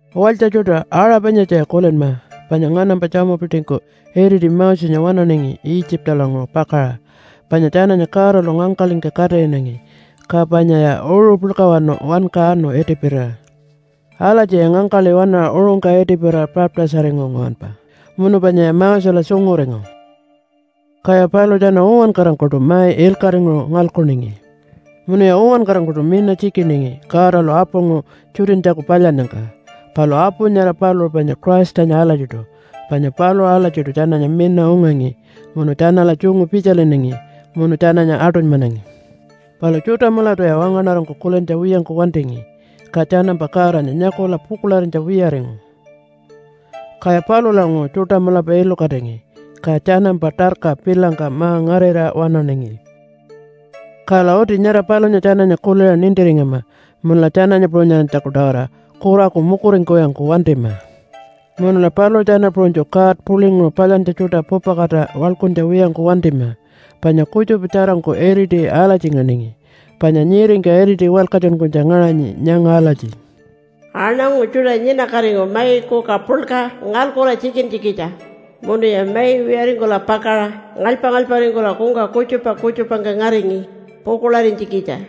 Walytja tjuṯa, aṟa panyatjaya kulinma, panya nganampa tjamupitingku iriti Mosenya waṉaningi Itjipalanguṟu pakaṟa. Panya tjananya Godalu ngangkaḻingka katiṟinangi. Ka panyaya uṟu puḻkawanu wanka anu itipirira. Alatjiya ngangkaḻi waṉaṟa uṟungka itipirira baptise-aringu nguwanpa, munu panyaya Mosela tjunguringu. Kaya paluṟu tjana uwankarangkuṯu mai ilkaṟinguṟu ngalkuningi. Munuya uwankarangkuṯu mina tjikiningi Godalu apunguṟu tjutinytjaku palyannyangka. Palu apu nyara paluṟu panya Christanya alatjiṯu, panya paluṟu alatjiṯu tjananya mina ungangi munu tjanala tjungu pitjalinangi munu tjananya aṯunymanangi. Palu tjuṯa mulatuya wangaṉarangku kulintja wiyangku wantingi, ka tjanampa Godanya nyakula pukuḻarinytja wiyaringu. Kaya palulanguṟu tjuṯa mulapa ilukatingi, ka tjanampa tarka pilangka ma-ngarira waṉaningi. Kala uti nyara palunya tjananya kuliṟa nintiringama munula tjananya puṟunyarinytjaku-tawara kuraku mukuringkuwiyangku wantima. Munula paluṟu tjana puṟunytju god puḻinguṟu palyantja tjuṯa pupakatira waḻkuntja wiyangku wantima, panya kutjupa tjarangku iriti alatjinangi. Panya nyiringka iriti walkatjunkunytja ngaṟanyi nyanga alatji, “Aṉangu tjuṯa nyinakatingu mai kuka puḻka ngalkula tjikintjikitja, munuya mai wiyaringkula pakaṟa ngalypa-ngalyparingkula kungka kutjupa kutjupangka ngaringi pukuḻarinytjikitja.”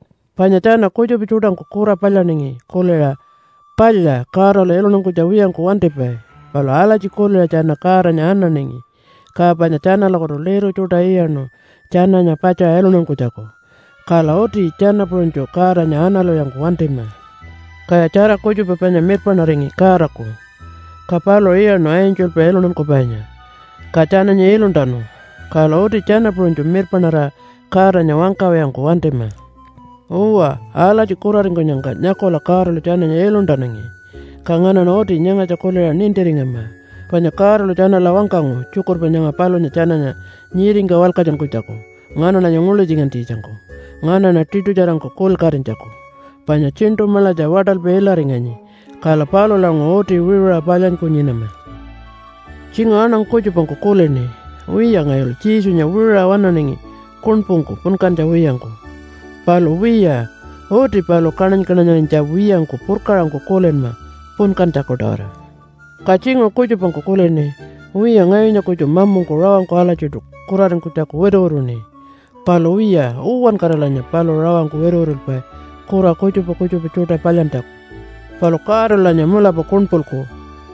Panya tjana kutjupa tjuṯangku kura palyaningi kuliṟa, “Palya, Godalu iluntankunytja wiyangku wantipai.” Palu alatji kuliṟa tjana Godanya ananingi, ka panya tjanalakutu liru tjuṯa iyaṉu tjananya patjaṟa iluntankunytjaku. Kala uti tjana puṟunytju Godanya analwiyangku wantima. Kaya tjara kutjupa panya mirpaṉaringi Godaku, ka paluṟu iyaṉu angelpa iluntankupainya, ka tjananya iluntanu. Kala uti tjana puṟunytju mirpaṉarira Godanya wangkawiyangku wantima. Uwa, alatji kuraringkunyangka nyakula Godalu tjananya iluntanangi, ka nganaṉa uti nyangatja kuliṟa nintiringama. Panya Godalu tjanala wangkangu tjukurpa nyanga palunya tjananya nyiringka walkatjunkunytjaku nganaṉanya nguḻutjunkunytjikitjangku nganaṉa tiṯutjarangku kulilkatinytjaku. Panya tjiṉṯu maḻatja waṯalpi ilaringanyi, kala palulanguṟu uti wiṟuṟa palyanyku nyinama. Tjinguṟu aṉangu kutjupangku kulini, “Wiya ngayulu Jesunya wiṟuṟa waṉaṉi kuṉpungku punkantja wiyangku.” Palu wiya, uti paluṟu kaṉany-kaṉanyarinytja wiyangku purkaṟangku kulinma punkantjaku-tawara. Ka tjinguṟu kutjupangku kulini, “Wiya ngayunya kutju mamungku rawangku alatjiṯu kuraringkunytjaku wituwituṉi.” Palu wiya, uwankaralanya paluṟu rawangku wituwitulpai kura kutjupa kutjupa tjuṯa palyantjaku. Palu Godalulanya mulapa kuṉpulku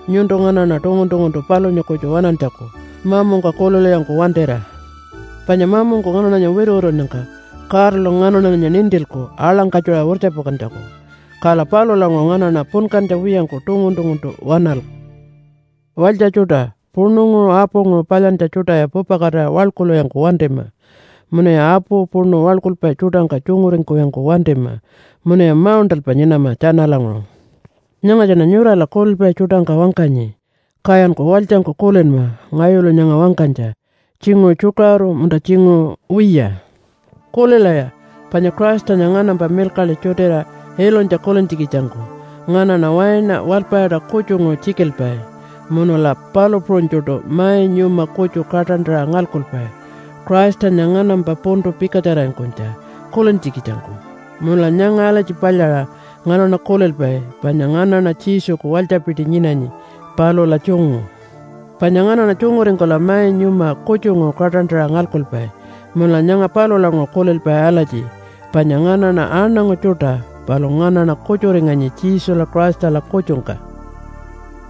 nyuntu nganaṉa tungun-tunguntu palunya kutju waṉantjaku mamungka kulilwiyangku wantira. Panya mamungku nganaṉanya wituwitunnyangka Godalu nganaṉanya nintilku aḻangkatjuṟa wirtjapakantjaku. Kala palulanguṟu nganaṉa punkantja wiyangku tungun-tunguntu waṉalku. Walytja tjuṯa, puṉunguṟu apunguṟu palyantja tjuṯaya pupakatira waḻkulwiyangku wantima munuya apu puṉu waḻkulpai tjuṯangka tjunguringkuwiyangku wantima munuya mauṉṯalpa nyinama tjanalanguṟu. Nyangatjaṉa nyurala kulilpai tjuṯangka wangkanyi, kayanku walytjangku kulinma ngayulu nyanga wangkanytja, tjinguṟu tjukaṟuru, munta tjinguṟu wiya. Kulilaya, panya Christanya nganampa milkaḻi tjutiṟa ilunytja kulintjikitjangku nganaṉa waina walpayaṯa kutjunguṟu tjikilpai munula palu puṟunytjuṯu mai nyuma kutju kaṯantaṟa ngalkupai Christanya nganampa puntu pikatjararingkunytja kulintjikitjangku. Munula nyanga alatji palyaṟa nganaṉa kulilpai, “Panya nganaṉa Jesuku walytjapiti nyinanyi palula tjungu.” Panya nganaṉa tjunguringkula mai nyuma kutjunguṟu kaṯantaṟa ngalkupai. Munula nyanga palulanguṟu kulilpai alatji, “Panya nganaṉa aṉangu tjuṯa, palu nganaṉa kutjuringanyi Jesula Christala kutjungka.”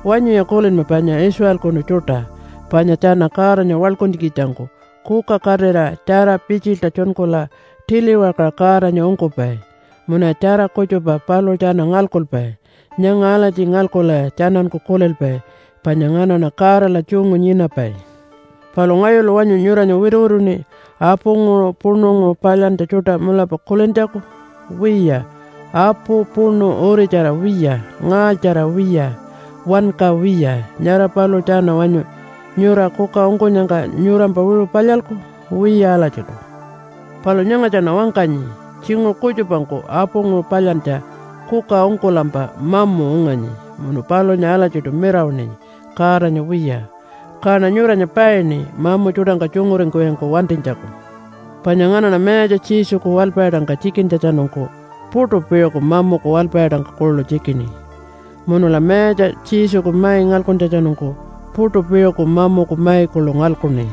Wanyuya kulinma panya Israelkunu tjuṯa, panya tjana Godanya waḻkuntjikitjangku kuka katira tjara pitjilta tjunkula tiliwakaṟa Godanya ungkupai munuya tjara kutjupa paluṟu tjana ngalkupai. Nyanga alatji ngalkulaya tjananku kulilpai, “Panya nganaṉa Godala tjungu nyinapai.” Palu ngayulu wanyu nyuranya wituwituṉi apunguṟu puṉunguṟu palyantja tjuṯa mulapa kulintjaku? Wiya, apu puṉu uritjara wiya, ngaalytjara wiya, wanka wiya. Nyara paluṟu tjana wanyu nyura kuka ungkunyangka nyurampa wiṟu palyalku? Wiya alatjiṯu. Palu nyangatjaṉa wangkanyi, tjinguṟu kutjupangku apunguṟu palyantja kuka ungkulampa mamu unganyi munu palunya alatjiṯu mirawaṉinyi Godanya wiya. Kaṉa nyuranya paini mamu tjuṯangka tjunguringkuwiyangku wantinytjaku. Panya nganaṉa Mayatja Jesuku walpayaṯangka tjikintjatjanungku puṯu piṟuku mamuku walpayaṯangka kuḻu tjikini. Munula Mayatja Jesuku mai ngalkuntjatjanungku puṯu piṟuku mamuku mai kuḻu ngalkuṉi.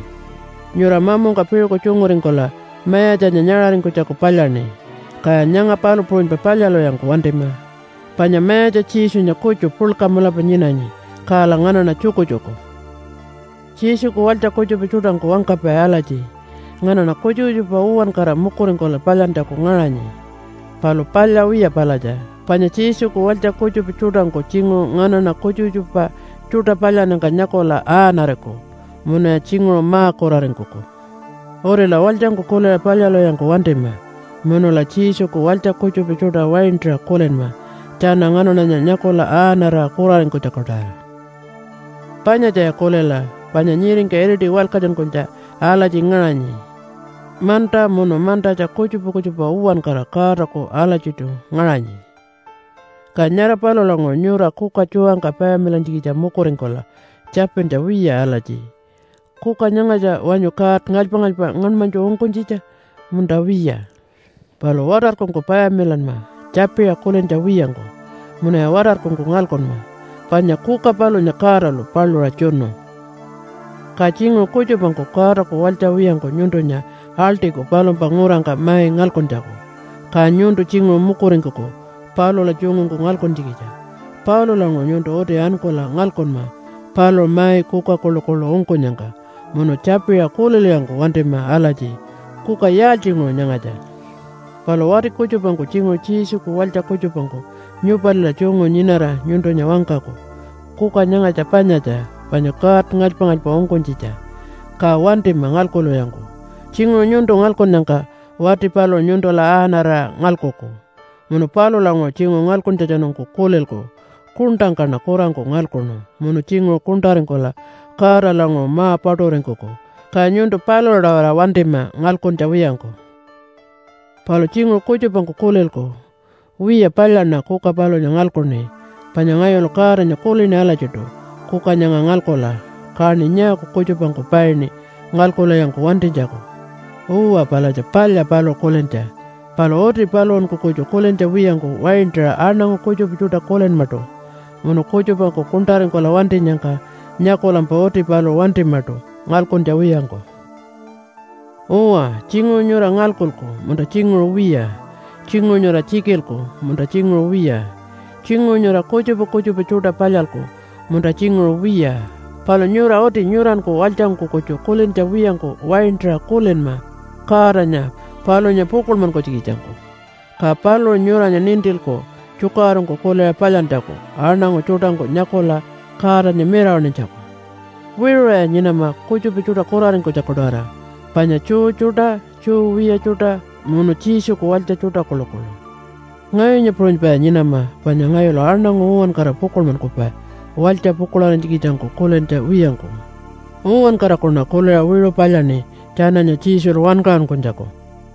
Nyura mamungka piṟuku tjunguringkula Mayatjanya nyaṟaringkunytjaku palyaṉi. Kaya nyanga palu puṟunypa palyalwiyangku wantima. Panya Mayatja Jesunya kutju puḻka mulapa nyinanyi, kala nganaṉa tjukutjuku. Jesuku walytja kutjupa tjuṯangku wangkapai alatji, “Nganaṉa kutjupa kutjupa uwankara mukuringkula palyantjaku ngaṟanyi.” Palu palya wiya palatja, panya Jesuku walytja kutjupa tjuṯangku tjinguṟu nganaṉa kutjupa kutjupa tjuṯa palyannyangka nyakula aaṉariku munuya tjinguṟu ma-kuraringkuku. Utila walytjangku kuliṟa palyalwiyangku wantima munula Jesuku walytja kutjupa tjuṯa waintaṟa kulinma tjana nganaṉanya nyakula aaṉarira kuraringkunytjaku-tawara. Panyatjaya kulila, panya nyiringka iriti walkatjunkunytja alatji ngaṟanyi, “Manta munu mantatja kutjupa kutjupa uwankara Godaku alatjiṯu ngaṟanyi.” Ka nyara palulanguṟu nyura kuka tjuwangka payamilantjikitja mukuringkulampa tjapintja wiya alatji, “Kuka nyangatja wanyu god ngalypa-ngalypa ngaṉmanytju ungkunytjitja munta wiya?” Palu watarkungku payamilanma tjapiṟa kulintja wiyangku, munuya watarkungku ngalkunma, panya kuka palunya Godalu paluṟa tjunu. Ka tjinguṟu kutjupangku Godaku walytja wiyangku nyuntunya aḻṯiku palumpa ngurangka mai ngalkuntjaku, ka nyuntu tjinguṟu mukuringkuku palula tjungungku ngalkuntjikitja. Palulanguṟu nyuntu uti ankula ngalkunma paluṟu mai kuka kuḻukuḻu ungkunyangka munu tjapiṟa kulilwiyangku wantima alatji, “Kuka yaaltjinguṟu nyangatja?” Palu wati kutjupangku tjinguṟu Jesuku walytja kutjupangku nyupalila tjungu nyinara nyuntunya wangkaku, “Kuka nyangatja panyatja, panya god ngalypa-ngalypa ungkunytjitja.” Ka wantima ngalkuwiyangku. Tjinguṟu nyuntu ngalkunnyangka wati paluṟu nyuntula aaṉarira ngalkuku. Munu palulanguṟu tjinguṟu ngalkuntjatjanungku kulilku, “Kuṉṯangkaṉa kurangku ngalkuṉu.” Munu tjinguṟu kuṉṯaringkula Godalanguṟu ma-paṯuringkuku. Ka nyuntu palula-tawara wantima ngalkuntja wiyangku. Palu tjinguṟu kutjupangku kulilku, “Wiya palyaṉa kuka palunya ngalkuṉi. Panya ngayulu Godanya kulini alatjiṯu kuka nyanga ngalkula. Kaṉi nyaaku kutjupangku paini ngalkuwiyangku wantinytjaku.” Uwa, palatja palya paluṟu kulintja. Palu uti paluṟunku kutju kulintja wiyangku waintaṟa aṉangu kutjupa tjuṯa kulinmaṯu. Munu kutjupangku kuṉṯaringkula wantinyangka nyakulampa uti paluṟu wantimaṯu ngalkuntja wiyangku. Uwa, tjinguṟu nyura ngalkuku munta tjinguṟu wiya, tjinguṟu nyura tjikilku munta tjinguṟu wiya, tjinguṟu nyura kutjupa kutjupa tjuṯa palyalku munta tjinguṟu wiya. Palu nyura uti nyuranku walytjangku kutju kulintja wiyangku waintaṟa kulinma Godanya palunya pukuḻmankunytjikitjangku. Ka paluṟu nyuranya nintilku tjukaṟurungku kuliṟa palyantjaku aṉangu tjuṯangku nyakula Godanya mirawaṉinytjaku. Wiṟuṟaya nyinama kutjupa tjuṯa kuraringkunytjaku-tawara, panya Jew tjuṯa, Jew wiya tjuṯa munu Jesuku walytja tjuṯa kuḻukuḻu. Ngayunya puṟunypaya nyinama panya ngayulu aṉangu uwankara pukuḻmankupai walytja pukuḻarinytjikitjangku kulintja wiyangku. Uwankarakuṉa kuliṟa wiṟu palyaṉi tjananya Jesulu wankaṟunkunytjaku.